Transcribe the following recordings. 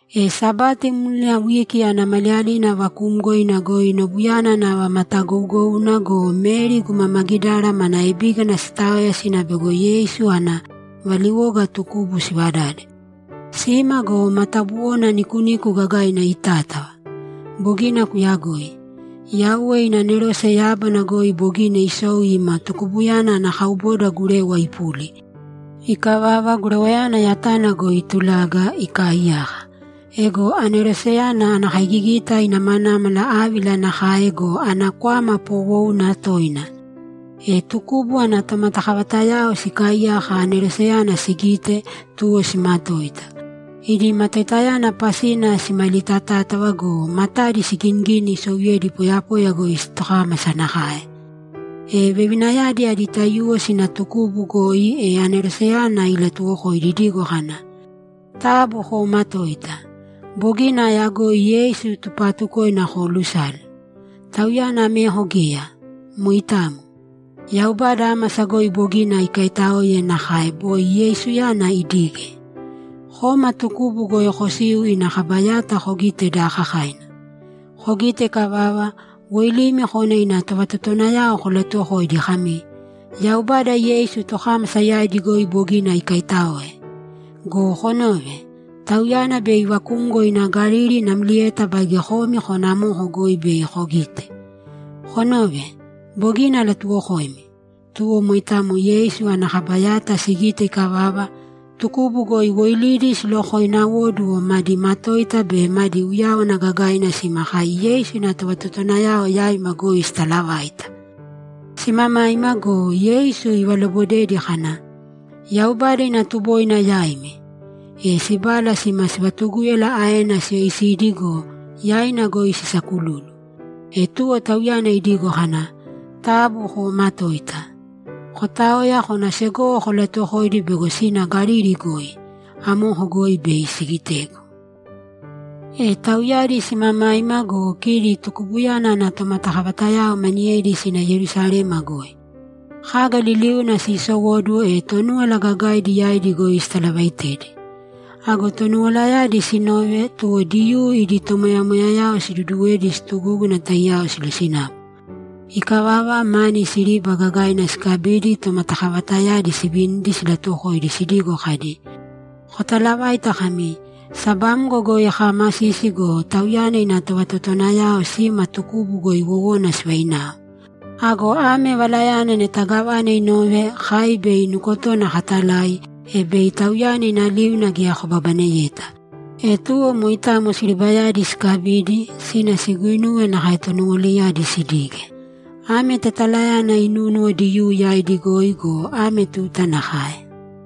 E Sabati mlina wiki ana maliyalina vakuumgoina goi nobuyana nava matagougouna go, Meri guma Magidara mana ebígana sitaoya sina bego Yeisu ana valiwoga tukubu sivadade. Sima go, matabuwona nikuniku gagaina itátava. Bogina kuyagoi. Yauwe ina anerose yábana goi bogina isou ina tukubuyana ana kauboda gurewa ipuli. Ikavava, gurewayana yatana goi itulaga, ikaaiyaka. Ego aneroseyana ana kaigigita inamanámala ávila nakae go, ana kwama poowouna toina. E tukubu ana tomatakavatayao sikaaiyaka aneroseyana sigite, tuwo simatoita. Idi matoitayana pasina simalitatátava go, matadi siginigini isouyedi poyapoya goi tokámasa nakae. E vevinayadi adi taiyuwo sina tukubu goi, e aneroseyana ilatuwokoidi idigo kana, ‘Taabu koomatōita! Bogina ayagoi Yeisu tupaatukoina koolusale. Tauyana ameko geya. Moitamo. Yaubada ámasa goi bogina ikaitáoe nakae boi Yeisuyana idige. Kōma tukubu goi kosīu ina kaba yata kogīte daakakaina. Kogite ikavava, woilīmi kōna ina tovatotowanayao kolatuwokōidi kami, “Yaubada Yeisu tokámasa yaidi goi bogina ikaitáoe. Go konōve! Tauyana bei ivakumgo ina Galili namlieta baige komi kōna amoko goi bei kogite.” Konōve, bogina alatuwokoimi.’ Tuwo moitamo Yeisu ana kaba yata sigite ikavava, tukubu goi woilidi silokoináoduwo, madi matoita be madi uyáwana gagaina sima kai Yeisu ina tovatotowanayao yaima goi sitalavaita. Simamaima go, Yeisu ivalobodedi kana, ‘Yaubada ina tuboina yaimi!’ E sibala sima sivatugúyala aena siyoisidi go, yaina goi sisakululu. E tuwo Tauyana idigo kana, ‘Taabu koomatōita. Kotāoya kōna segowo kolatuwokōidi bego sina Galili goi. Amoko goi bei sigitegu.’ E tauyadi simamaima go, kidi tukubuyana ana tomatakavatayao maniyedi sina Yerusalema goi. Kaga liliuna siisowóduwo, e Tonúwala Gagaidi yaidi goi sitalavaitedi. Ago Tonuwalayadi sinove, tuwo Diyuu idi tomoyamoyayao siduduwedi situgúguna taiyao silosinapu. Ikavava, mani siriba gagaina sikabidi tomatakavatayadi sivinidi silatuwokoidi sidigo kadi, ‘Kotalavāita kami, “Sabamgo goi kaamasisi go, Tauyana ina tovatotowanayao sima tukubu goi wowona sivainao.” Ago ame valayana neta gávana inove, kai bei nukotona katalai, e bei tauyana ina liuna geya kobabaneyeta.’ E tuwo moitamo siribayadi sikabidi, sina siguinuwe nakae Tonuwalayadi sidige. Ame tetalayana inúnuwo Diyuu yaidi goi go, ame tuta nakae.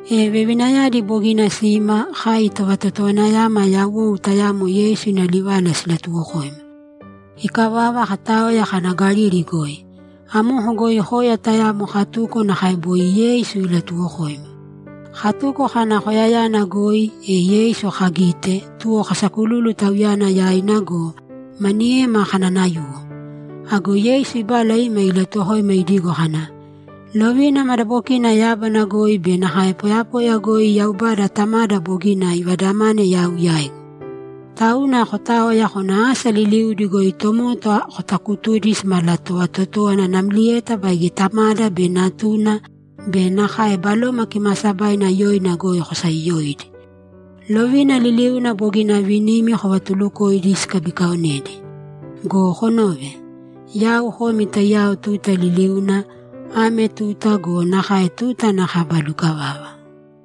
E vevinayadi bogina sima, kai tovatotowanayama yawou tayamo Yeisu ina livala silatuwokoima. Ikavava, kataoya kana Galili goi. Amoko goi koya tayamo katuko nakae boi Yeisu ilatuuwokoima. Katuko kana koyayana goi, e Yeisu kagite, tuwo kasakululu Tauyana yaina go, maniyema kananayuwo. Ago Yeisu ibala ima ilatuwokoima idigo kana, ‘Lovina madabokina yábana goi be nakae poyapoya goi Yaubada Tamada bogina ivadamane yau yaigu. Tauna kotāoya kōna asa liliudi goi tomota kotakutūdi simalatovatotówana namlieta baige Tamada be Natuna be nakae Baloma Kimaasabaina yoina goi kosayoyōidi. Lovina liliuna bogina avinimi kovatulukōidi sikabikaonedi. Go konōve. Yau komi taiyao tuta liliuna, ame tuta go, nakae tuta ana kaba lukavava.’